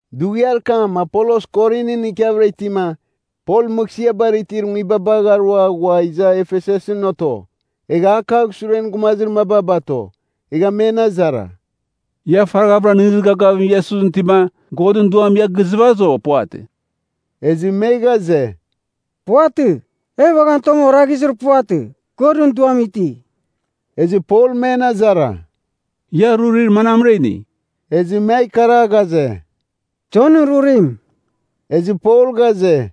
Dughiar kam Apolos Korinɨn ikiavɨra itima, Pol mɨghsɨabar itir nguibabagh arua ghua iza Efesusɨn oto. Egha a kagh suren gumazir maba bato. Egha men azara, “Ia faraghavɨra nɨghnɨzir gavgavim Iesusɨn itima, Godɨn Duam ia gizɨvazɨ, o puvatɨ?” Ezɨ me ghaze, “Puvatɨ, e uaghan tong oraghizir puvatɨ, Godɨn Duam iti.” Ezɨ Pol men azara, “Ia rurir manamra ini?” Ezɨ me ikara ghaze, “Jonɨn rurim.” Ezɨ Pol ghaze,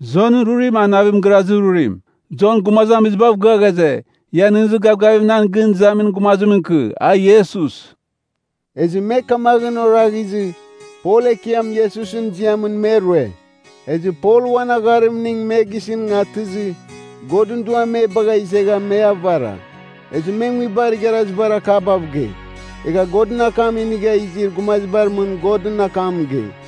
“Jonɨn rurim a navim girazir rurim. Jon gumazamizibav gɨa ghaze, ia nɨghnɨzir gavgavim nan gɨn izamin gumazimɨn ikɨ, a Iesus.” Ezɨ me kamaghɨn oraghizɨ, Pol Ekiam Iesusɨn ziamɨn me rue. Ezɨ Pol uan agharimning me gisɨn atɨzɨ, Godɨn Duam me bagha izegha me avara. Ezɨ me nguibar igharazibar akabav gei. Egha Godɨn akam inigha izir gumazibar mɨn Godɨn akam mɨgei.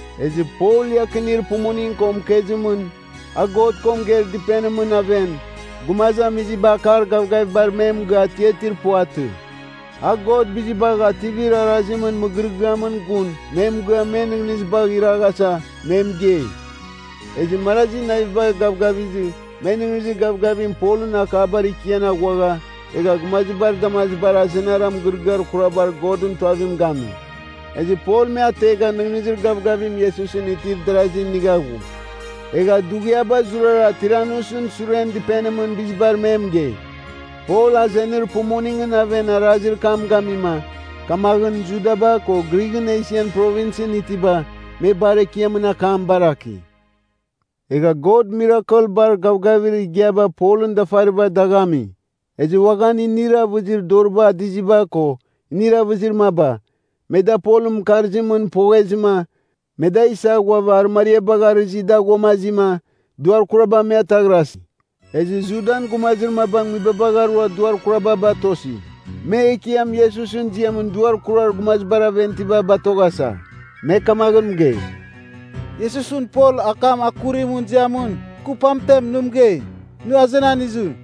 Ezɨ Pol iakinir pumuning ko mɨkezimɨn, a God ko mɨgeir dɨpenimɨn aven, gumazamiziba akar gavgavibar me mɨgɨa atiatir puvatɨ. A God Bizibagh Ativir Arazimɨn mɨgɨrɨgɨamɨn gun me mɨgɨa men nɨghnɨziba iraghasa me mɨgei. Ezɨ marazir naviba gavgavizɨ, me nɨghnɨzir gavgavim Polɨn akabar ikian aghuagha, egha gumazibar damazibar azenara mɨgɨrɨgɨar kurabar Godɨn Tuavim gami. Ezɨ Pol me ategha nɨghnɨzir gavgavim Iesusɨn itir darazi inigha ghu. Egha dughiaba zurara Tiranusɨn suren dɨpenimɨn bizibar me mɨgei. Pol azenir pumuningɨn aven arazir kam gamima, kamaghɨn Judaba ko Grighɨn Esian Provinsɨn itiba, me bar Ekiamɨn akam baraki. Egha God mirakel bar gavgavir igiaba Polɨn dafariba dagh ami. Ezɨ uaghan inir avɨzir doriba adiziba ko, inir avɨzir maba, me da Polɨn mɨkarzimɨn poghezɨma, me da isa ghuava arɨmariabagh arɨzi da ghuamazima, duar kuraba me ataghrasi. Ezɨ Judan gumazir maba nguibabagh arua duar kuraba batosi. Me Ekiam Iesusɨn ziamɨn duar kurar gumazibar aven itiba batoghasa. Me kamaghɨn mɨgei, “Iesusɨn Pol akam akurimɨn ziamɨn, kɨ pamtem nɨ mɨgei, ‘Nɨ azenan izɨ.’”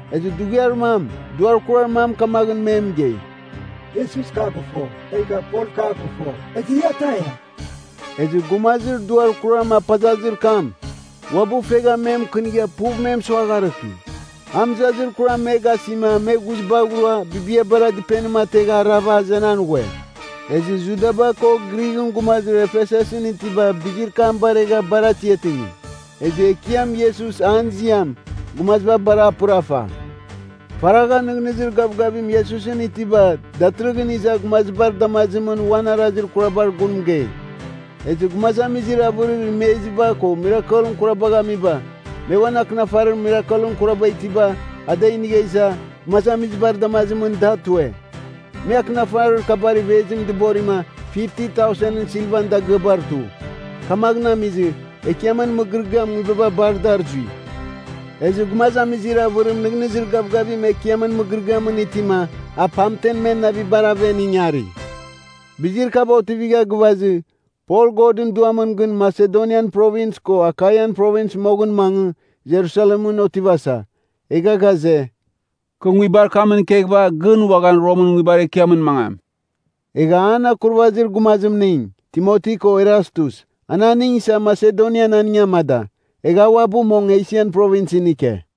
Ezɨ dughiar mam, duar kurar mam kamaghɨn me mɨgei, “Iesus, kɨ a gɨfo, egha Pol kɨ a gɨfo, ezɨ ia taia?” Ezɨ gumazir duar kuram apazazir kam, uabɨ fegha me mɨkɨnigha puv me mɨsuagharɨki. A mɨzazir kuram me gasima me ghuzibagh rua bibiabara dɨpenim ategha arava azenan ghue. Ezɨ Judaba ko Grighɨn gumazir Efesusɨn itiba bizir kam baregha bar atiatingi. Ezɨ Ekiam Iesus an ziam, gumaziba bar a pɨrafa. Faragha nɨghnɨzir gavgavim Iesusɨn itiba datɨrɨghɨn iza gumazibar damazimɨn uan arazir kurabar gun mɨgei. Ezɨ gumazamizir avɨrir imeziba ko mirakel kurabagh amiba, me uan akɨnafarir mirakel kuraba itiba a da inigha iza, gumazamizibar damazimɨn da tue. Me akɨnafarir kabar ivezim dɨborima, 50,000ɨn silvan dagɨabar tu. Kamaghɨn amizɨ, Ekiamɨn mɨgɨrɨgɨam nguibaba bar dar zui. Ezɨ gumazamizir avɨrim nɨghnɨzir gavgavim Ekiamɨn mɨgɨrɨgɨamɨn itima a pamtem men navibar aven ingari. Bizir kaba otivigha gɨvazɨ, Pol Godɨn Duamɨn gɨn Masedonian Provins ko Akaian Provins moghɨn mangɨ, Jerusalemɨn otivasa. Egha ghaze, “Kɨ nguibar kamɨn ikeghɨva, gɨn uaghan Romɨn nguibar ekiamɨn mangam.” Egha an akurvazir gumazimning, Timoti ko Erastus, an aning isa Masedonian aning amada. Egha a uabɨ mong Esian Provinsɨn ike.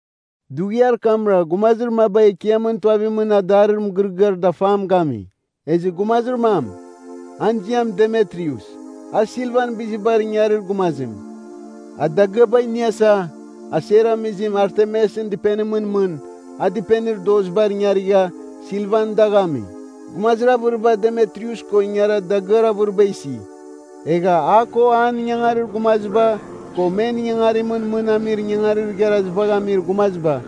Dughiar kamra gumazir maba Ekiamɨn Tuavimɨn adarir mɨgɨrɨgɨar dafam gami. Ezɨ gumazir mam, an ziam Demitrius. A silvan bizibar ingarir gumazim. A dagɨaba iniasa, aser amizim Artemisɨn dɨpenimɨn mɨn, a dɨpenir dozibar ingarigha, silvan dagh ami. Gumazir avɨriba Demitrius ko ingara dagɨar avɨriba isi. Egha a ko an ingangarir gumaziba ko men ingangarimɨn mɨn amir ingangarir igharazibagh amir gumaziba,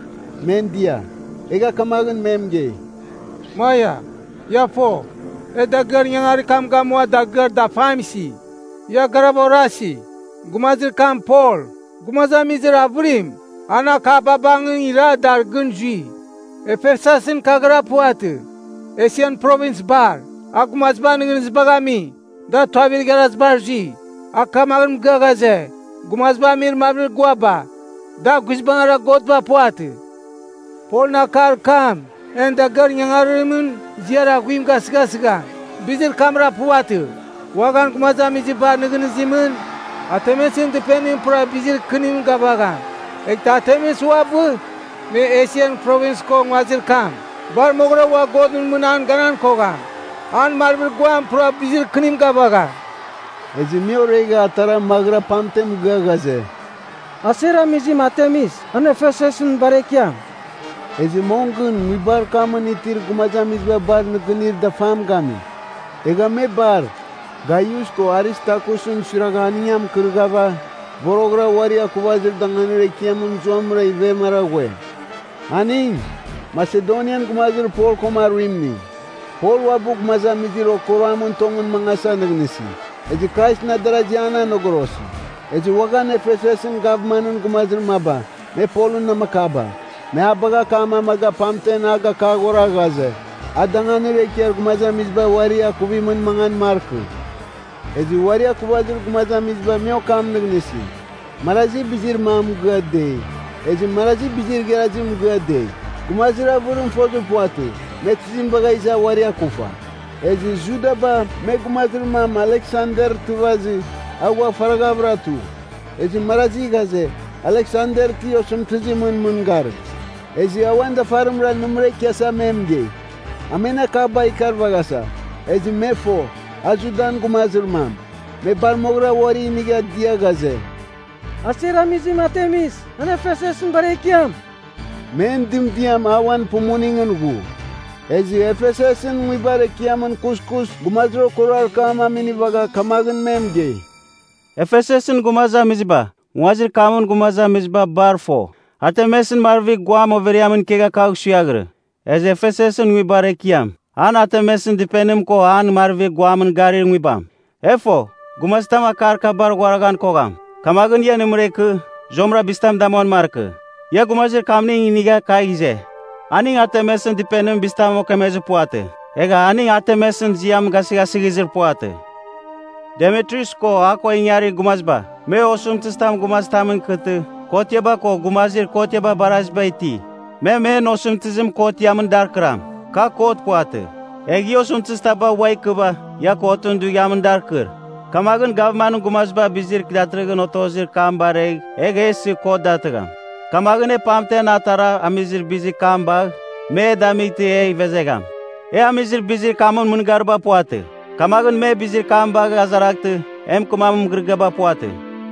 men dia. Egha kamaghɨn mɨgei, “Maia, ia fo. E dagɨar ingangarir kam gamua dagɨar dafam isi. Ia garava orasi, gumazir kam Pol, gumazamizir avɨrim an akaba bangɨn ira dar gɨn zui. Efesusɨn kaghɨra puvatɨ, Esian Provins bar. A gumazibar nɨghnɨzibagh ami, da tuavir igharazibar zui. A kamaghɨn mɨgɨa ghaze, gumaziba amir marvir guaba, da guizbangɨra godba puvatɨ. Polɨn akar kam en dagɨar ingangarimɨn ziar aghuim gasɨghasigham. Bizir kamra puvatɨ, uaghan gumazamizibar nɨghnɨzimɨn, Artemisɨn dɨpenim pura bizir kɨnim gavagham. Eghtɨ Artemis uabɨ, me Esian Provins ko nguazir kam bar moghɨra ua godɨn mɨn an ganan kogham. An marvir guam pura bizir kɨnim gavagham!” Ezɨ me oregha atara maghɨra pamtem mɨgɨa ghaze, “Aser amizim Artemis, an Efesusɨn bar Ekiam!” Ezɨ mong gɨn nguibar kamɨn itir gumazamiziba bar nɨgɨnir dafam gami. Egha me bar, Gaius ko Aristarkusɨn suiragha aning a mɨkɨrɨghava, voroghɨra uari akuvir danganir ekiamɨn zuamɨra ivemara ghue. Aning, Masedonian gumazir Pol koma aruimning. Pol uabɨ gumazamizir okuruamɨn tongɨn mangasa nɨghnɨsi. Ezɨ Kraisɨn adarazi an anogorosi. Ezɨ uaghan Efesusɨn gavmanɨn gumazir maba, me Polɨn namakaba, me a bagha akam amaga pamtem a gakaghora ghaze, a danganir ekiar gumazamiziba uari akuvimɨn mangan markɨ. Ezɨ uari akuvazir gumazamiziba me okam nɨghnɨsi, marazi bizir mam mɨgɨa dei, ezɨ marazi bizir igharazim mɨgɨa dei. Gumazir avɨrim fozir puvatɨ, me tizim bagha iza uari akufa. Ezɨ Judaba, me gumazir mam Aleksander tɨvazɨ, a ghua faraghavɨra tu. Ezɨ marazi ghaze, Aleksander ti osɨmtɨzimɨn mɨngarim. Ezɨ a uan dafarimra nɨmɨra ikiasa me mɨgei. A men akaba ikarvaghasa. Ezɨ me fo, a Judan gumazir mam, me bar moghɨra uari inigha dia ghaze, “Aser amizim Artemis, an Efesusɨn bar Ekiam.” Men dɨmdiam auan pumuningɨn ghu. Ezɨ Efesusɨn nguibar ekiamɨn kuskus gumazir okuruar kam me aminivagha kamaghɨn me mɨgei, “Efesusɨn gumazamiziba, nguazir kamɨn gumazamiziba bar fo. Artemisɨn marvir guam overiamɨn ikegha kagh suiaghirɨ. Ezɨ Efesusɨn nguibar ekiam, an Artemisɨn dɨpenim ko an marvir guamɨn garir nguibam. E fo, gumazitam akar kabar ghuaraghan kogham. Kamaghɨn ia nɨmɨra ikɨ, zuamɨra bizitam damuan markɨ. Ia gumazir kamning inigha kagh ize. Aning Artemisɨn dɨpenimɨn bizitam okemezir puvatɨ. Egha aning Artemisɨn ziam gasɨghasɨghizir puvatɨ. Demitrius ko a ko ingarir gumaziba, me osɨmtɨzitam gumazitamɨn ikɨtɨ, kotiaba ko gumazir kotiaba baraziba iti. Me men osɨmtɨzim kotiamɨn dar kɨram. Ka kot puvatɨ. Egh ia osɨmtɨzitaba ua ikɨva, ia kotɨn dughiamɨn dar kɨr. Kamaghɨn gavmanɨn gumaziba bizir datɨrɨghɨn otozir kam baregh, egh e isɨ kot datɨgham. Kamaghɨn e pamtem atara amizir bizir kam bagh, me e damightɨ e ivezegham. E amizir bizir kamɨn mɨngariba puvatɨ. Kamaghɨn me bizir kam bagh azaraghtɨ e mɨkɨmamin mɨgɨrɨgɨaba puvatɨ.”